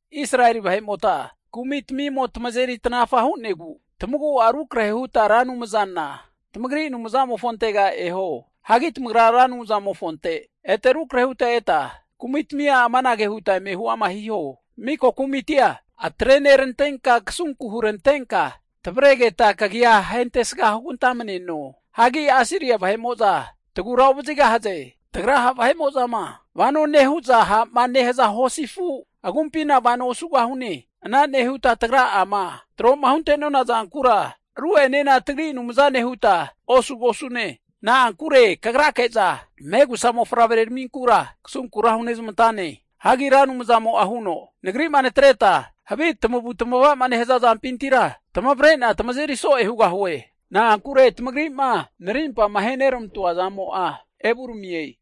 Israeli vahe'mota kumi'tamimo tamazeri tanafa hu'negu tamagu'a rukrahe huta Ra Anumzana tamagri Anumzamofontega eho. Hagi tamagra Ra Anumzamofonte ete rukrahe huta eta kumitamia amanage huta eme huama hiho. Miko kumitia atrenerantenka kasunku hurantenka tavaregeta kagia ahentesga hugantamneno. Hagi Asiria vahe'mo'za tagura ovazigahaze. Tagra ha' vahe'mo'zama vano nehu'za ha'ma nehaza hosi afu agumpina vano osugosune. Ana nehuta tagra'ama troma hunte'nona zankura ru'enena tagri anumzane huta osugosune. Na'ankure kagrake'za megusa mofavreraminkura kasunkura hunezmantane. Hagi Ra Anumzamo'a huno, Nagri'ma natreta havi tamavu tamava'ma nehaza zampintira tamavre'na tamazeri so'e hugahue. Na'ankure tamagri'ma narimpama aheneramantoa zamo'a evuramie.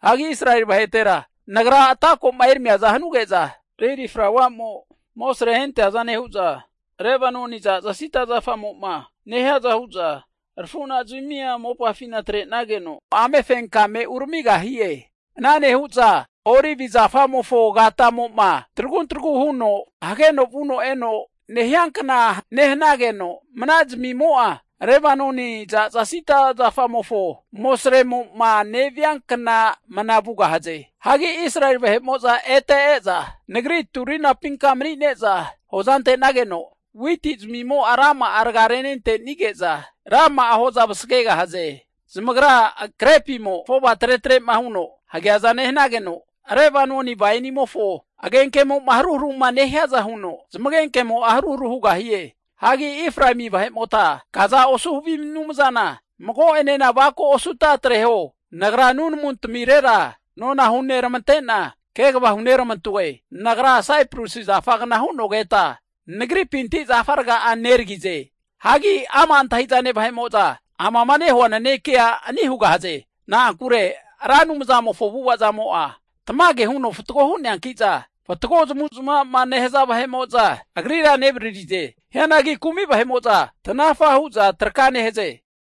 Hagi Israeli vahetera Nagra ata ko'ma eramiaza hanuge'za, lili flauamo amosre ahenteaza nehu'za Lebanoni zaza sida zafamo'ma nehiaza hu'za arafu'nazmia mopafina atre'nageno amefenkame uramigahie. Ana nehu'za olivi zafamofo agatamo'ma tragun tragu huno hageno vuno eno nehiankna nehanageno, mana'zmimo'a Lebanoni zaza sida zafamofo amosremo'ma neviankna mana vugahaze. Hagi Israeli vahe'mo'za ete e'za, Nagri turunapinka mani'neza hoza ante'nageno witi zamimo'a rama'a raga renentenige'za, rama'a hoza vasagegahaze. Zamagra grepimo afova tretre'ma huno hageaza nehanageno, Lebanoni wainimofo agenkemo'ma haruharuma nehiaza huno zamagenkemo'a haruharu hugahie. Hagi Efraemi vahe'mota, kaza osu havi anumzana mago'enena avako osuta atreho! Nagra nunamu tamirera nona huneramante'na kegava huneramantoe. Nagra saipresi zafagna hu'nogeta, Nagripinti zafa raga neragize. Hagi knare antahi'zane vahe'mo'za amama nehua nanekea antahi ama' hugahaze. Hagi ama' antahi'zane vahe'mo'za amama nehua nanekea ani' hugahaze. Na'ankure Ra Anumzamofo avu'ava zamo'a tamage huno fatgo hu'neanki'za, fatgo zamavu zamava'ma nehaza vahe'mo'za Agrira nevaririze. Hianagi kumi vahe'mo'za tanafa hu'za traka nehaze.